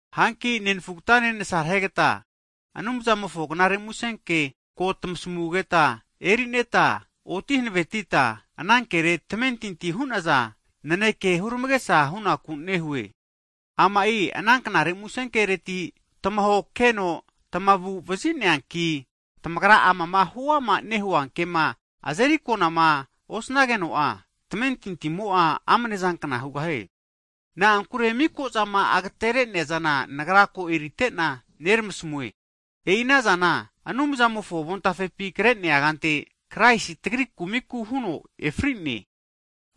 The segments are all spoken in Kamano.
Hanki nenfugatane nasarehegata Anumzamofo knare musenke ko tmasamugeta eri'neta, oti hanavetita anankere tamentinti hu'naza naneke hurmagesa hunaku nehue. Ama'i ana knare musenkereti tmahokeno tamagu'vazineanki, tamagra ma amama huama nehua kema azeri akonama osnageno'a, tamentintimo'a amne'zankna hugahie. Na'ankure miko'zama agatere'neazana nagra ko erite'na, neramasmue. E'i anazana Anumzamofo avontafepi kre'nea kante Kraisi tagri kumiku huno efri'ne.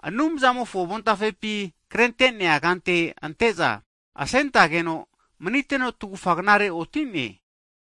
Anumzamofo avontafepi krente'nea kante ante'za asentetageno maniteno tgufa knare oti'ne.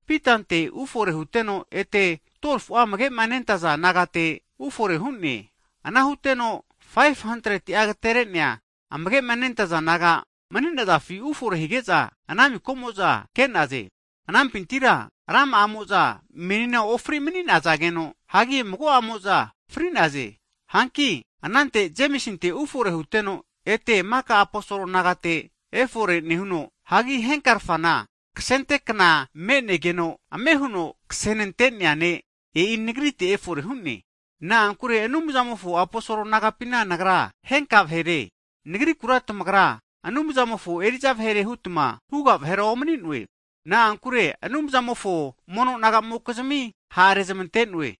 Pitante (Sifas) ufore huteno, ete 12fu'a amage'ma nentaza disaipol nagate ufore hu'ne. Ana huteno 500ti'a agatere'a amage'ante disaipol naga mni'nazafi ufore hige'za ana miko'mo'za ke'naze. Anampintira rama'amo'za menina ofri manizageno, hagi mago'amo'za fri'naze. Hanki anante Jemisinte ufore huteno, ete maka aposol nagate efore nehuno, hagi henka'arfana, kasentega kna me'negeno ame huno kasenante'nea ne', e'i nagrite efore hu'ne. Na'ankure Anumzamofo aposol nagapina nagra henka vahere, nagrikura tamagra Anumzamofo eri'za vahere hutma huga vahera omni'noe. Na'ankure Anumzamofo mono nagamokizmi ha' rezmante'noe.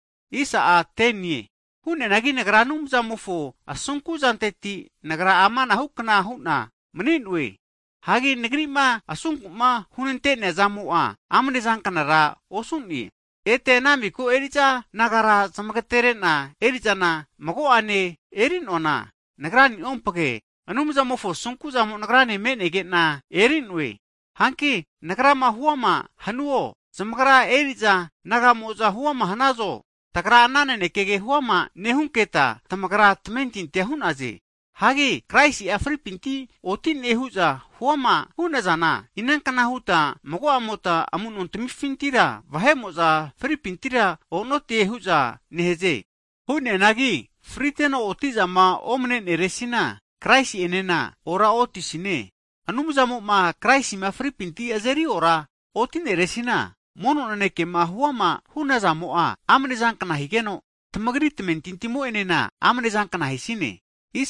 Hu'neanagi Anumzamofo asunku'zanteti nagra amanahu kna hu'na mni'noe. Hagi nagri'ma asunku'ma hunante'neazamo'a amne zankanara osu'ne. Ete ana miko eri'za nagara zmagatere'na eri'zana mago'ane eri'noana nagra'niompage, Anumzamofo asunkuzamo'a nagrane me'nege'na eri'noe. Hanki nagra huama hanuo, zamagra eri'za naga'mo'za huama hnazo, tagra ana nanekege huama nehunketa tamagra tamentintia hu'naze. Hagi Kraisi'a fripinti oti'ne hu'za huama hu'nazana, inanka huta mago'amota amu'nontmifintira, vahe'mo'za fripintira o'notize huta nehze? Hu'neanagi friteno oti'zama omneneresina, Kraisi enena ora otisine. Anumzamo'a Kraisina fripinti azeri ora oti'neresina, mono nanekema huama hu'nazamo'a amne'zankna higeno, tamagri tamentintimo'enena amne'zankna hisine.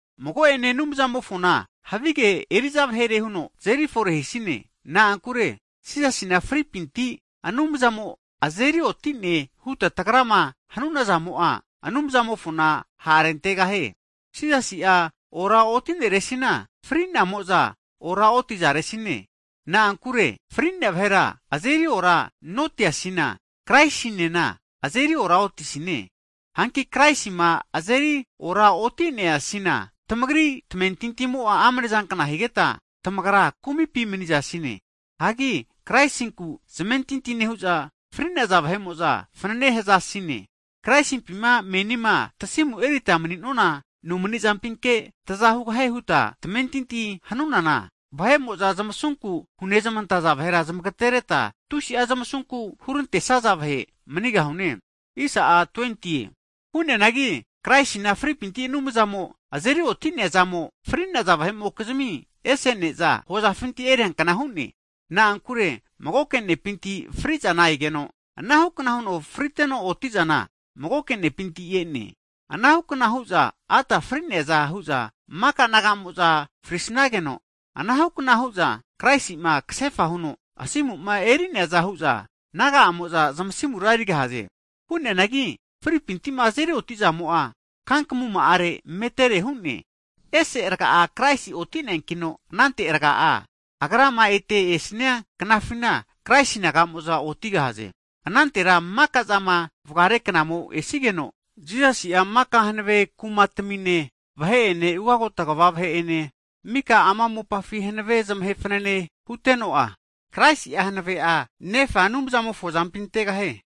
Mago ene Anumzamofona havige eri'za vahere huno tazeri fore hisine. Na'ankure Jisasina fri'nefinti Anumzamo azerioti'ne huta tagrama hanuna zamo'a, Anumzamofona ha'rentegahie. Jisasi'a ora'otineresina, fri'namo'za ora'otizaresine. Na'ankure fri'nea vahera azeri oranotiasina, Kraisinena azeri ora otisine. Hanki Kraisima azeri oraotineasina tamagri tamentintimo'a amnezanka higeta, tamagra kumipi manizasine. Hagi Kraisinku zamentinti nehu'za fri'naza vahe'mo'za fanene hazasine. Kraisimpi menima tasimu erita mni'nona nomnizampike taza hugahie huta tamentinti hanunana, vahe'mo'za zmasunku hunezmantaza vahera zmagatereta, tusi'a zmasunku hurantesaza vahe manigahune. Hu'neanagi Kraisina fripinti Anumzamo azeri oti'neazamo'a, fri'naza vahe'mokizmia ese ne'za hozafinti eriankna hu'ne. Na'ankure magoke ne'pinti fri'zana egeno, anahukna huno friteno oti'zana magoke nepinti e'ne. Anahukna hu'za Adamu fri'neaza hu'za maka naga'amo'za frisnageno, anahukna hu'za Kraisi'ma kasefa huno asimu'ma eri'neaza hu'za, naga'amo'za zmasimura erigahaze. Hu'neanagi mago magomofona fripinti'ma azeri oti'siana kankamuma'a metere hu'ne. Esera Kraisi oti'neankino anantera, Agrama ete esnia knafina, Kraisi naga'moza otigahaze. Anantera mika'zama vgare knamo esigeno, Jisasi'a maka hanave kumatamine vahe'ene, ugagota kva vahe ene mika ama mopafi hanavema zmahe fanane hute'nuno'a, Kraisi'a hanave'a Nefa Anumzamofo azampi antegahie.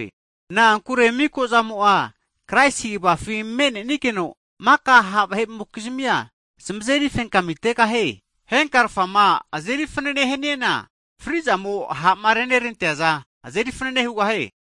Na'ankure miko'zamo'a Kraisi kvafi me'nenigeno, mika ha' vahe'amokizmia zmazeri fenkamitegahie. Henka rfama, azeri fanene haniana fri'zamo ha'ma reneranteazana, ahe fanane hugahie.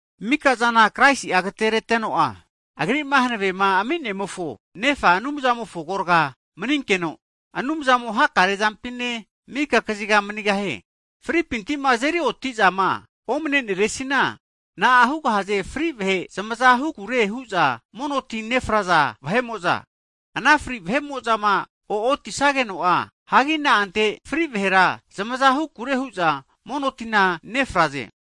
Mika'zana Kraisi'a agatereteno, Agri'ma hankavema ami'nemofo, Nefa Anumzamofo agorga maninkeno, Anumzamo hakare zampine, mika kaziga manigahie. Fripinti'ma azeri oti'zama omne'neresina, na'a hugahaze fri vahe zmaza hukure hu'za mono ti nefraza vahe'moza? Ana fri vahe'mo'zama o'otisageno'a, hagi na'ante fri vahera zmaza hukure hu'za mono tina nefraze?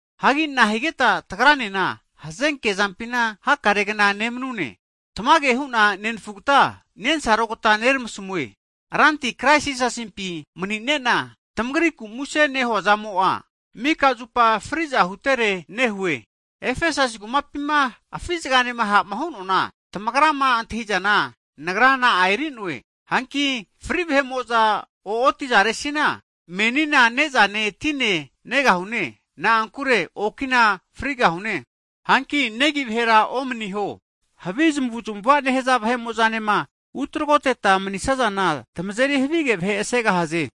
Hagi nahigeta tagranena hazenke zampina hakaregna nemnune? Tmage hu'na, nenfugata nensarogta neramasmue. Ranti Krais Jisasimpi mani'nena tamagriku muse nehuazamo'a, mika zupa fri'za hutere nehue. Efesasi kumapima afi' zgane ha'ma hu'noana, tamagrama antahizana nagra na'a eri'noe? Hanki fri vahe'mo'za o'otizaresina, menina ne'zane tine negahune, na'ankure okina frigahune. Hanki negi vahera omniho. Havi zamavuzmava nehaza vahe'mo'zane utagroteta mnisazana tmazeri havige vahe asegahaze.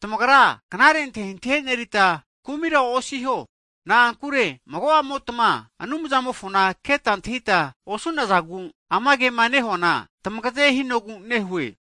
Tamagra knare antahintahi enerita kumira osiho. Na'ankure mago'amotma Anumzamofona keta antahita osu'nazagu, ama kema nehuana tamagaze hinogu nehue.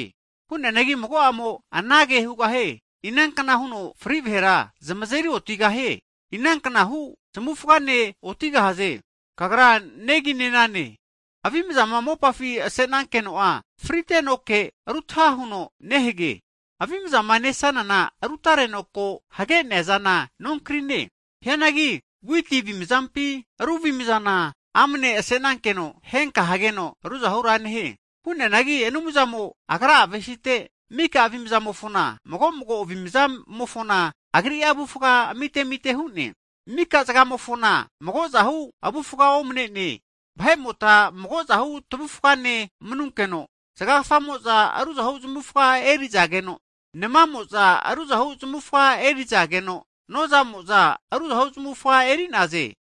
Hu'neanagi mago'mo'a anage hugahie. Inankna huno fri vahera zamazeri otigahie? Inanknahu zamufgane otigahaze? Kagra Neginenane! Avimazama mopafi ase'nankeno'a fritenoke rutaha huno nehage. Avimzama nesanana rutareno ko hage'nea zana nonkrine. Hianagi witi avimazapi ru avimazana amne ase'nankeno henka hageno ruzahura nehie. Hu'neanagi Anumzamo Agra'a avesite mika avimzamofona, mago mago avimzamofona agri'a avufga'a amite amite hu'ne. Maka zgamofona mago'zahu avufga omne'ne. Vahe'mota mago'zahu tvufgane manunkeno, zgagafamo'za ruzahu zmavufga erizageno, nmamo'za ruzahu zmufga erizageno, noza'mo'za ru zmufga eri'naze.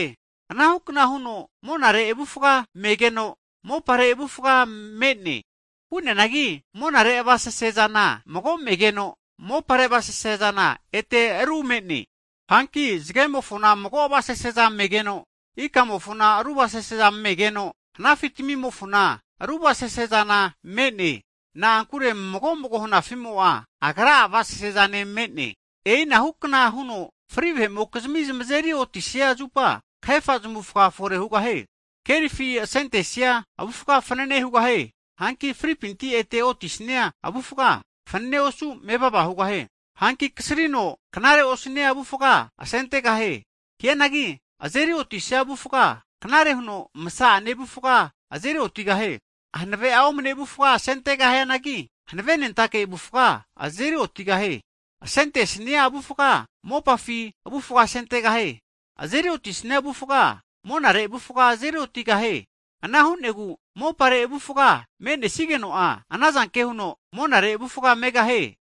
Anahukna huno monare avufga megeno, mopare avufga me'ne. Hu'neanagi monare avasese zana mago megeno, mopare avasese zana ete me'ne. Hanki zgemofona mago avasaseza megeno, ikamofona ru avasaseza megeno, hanafitamimofona ru avasase zana me'ne. Na'ankure mago mago hanafi'mo'a, agra'a avasasezane me'ne. E'inahu kna huno fri vahe'mokizmi zmazeri otisia zupa, kahefa zamufga fore hugahie. Kerifi asentesia avufga fanane hugahie. Hanki fripinti ete otisania avufga, fanane osu mevava hugahie. Hanki kasrino knare osu'nenia avufga asentegahie. Hianagi azeri otisia avufga, knare huno masa'ane avufgare azeri otigahie. Hanave'a omne avufga asentegahianagi, hanave nentake avufga azeri otigahie. Asentesnia avufga mopafi avufga asentegahie. Azeri otisnia avufga, monare avufga azeri otigahie. Ana hu'negu mopare avufga me'nesigeno'a, anazanke huno monare avufgane megahie.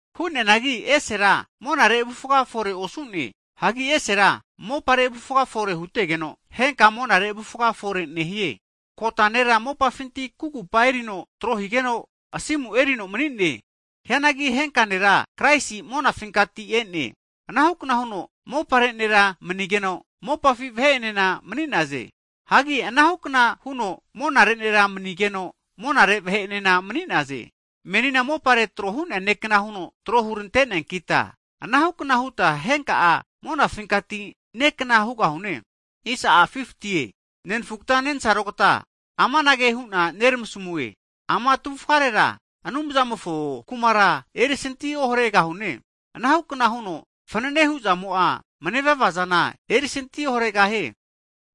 Hu'neanagi esera monare avufga fore osu'ne. Hagi esera mopare avufga fore hutegeno, henka monare avufga fore nehie. Kota nera mopafinti kugupa erino tro higeno asimura erino mni'ne. Hianagi henka nera Kraisi monafinkati e'ne. Anahukna huno mopare nera manigeno, mopafi vahe'enena mani'naze. Hagi anahukna huno monare nera manigeno, monare vahe'enena mani'naze. Menina mopare tro hu'nea ne'kna huno tro hurante'neankita, anahukna huta henka'a monafinkati ne' kna hugahune. Nenafugta nensarogta amanage hu'na neramasamue, ama tavufgarera Anumzamofo Kumara erisanti oharegahune. Anahu kna huno fnanene hu'zamo'a manevava zana erisanti oharegahie.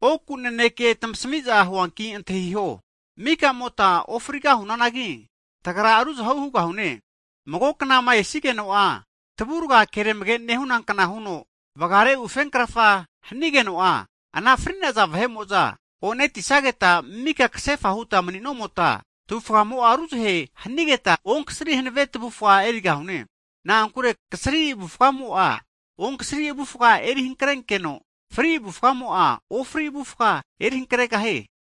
Oku naneke tmasami'za huanki antahiho, mika'mota ofrigahunanagi tagra ruzahe hugahune. Mago knama esigeno'a, tvurga keramage nehuna kna huno, vgare ufenkrafa hanigeno'a, ana fri'naza vahe'mo'za o'netisageta mika kasefa huta mni'nomota tavufamo'a ruzahe hanigeta onkasari hanave tavufa erigahune. Na'ankure kasri avufgamo'a onksari avufga eri hankrenkeno, fri avufgamo'a ofri avufga eri hankregahie.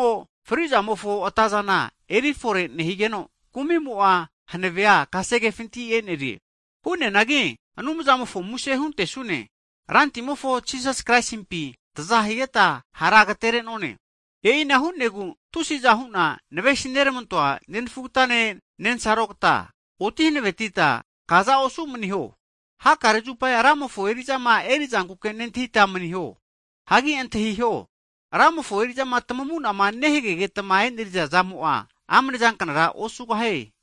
Kumi'mo fri'zamofo atazana eri fore nehigeno, kumi'mo'a hanave'a kasegefinti e'nerie. Hu'neanagi Anumzamofo muse huntesune, Rantimofo Jisasi Kraisimpi taza higeta hara agatenerone. E'ina hu'negu tusiza hu'na navesi nermantoa nenfugata nensarogta, oti hanavetita kaza osu maniho. Hakare zupa Ramofo eri'zama eri'zankuke nentahita mniho. Hagi antahio, Ramofo eri'zama tamamu'nama nehagegetma e'neriza zamo'a amnezanknara osugahie.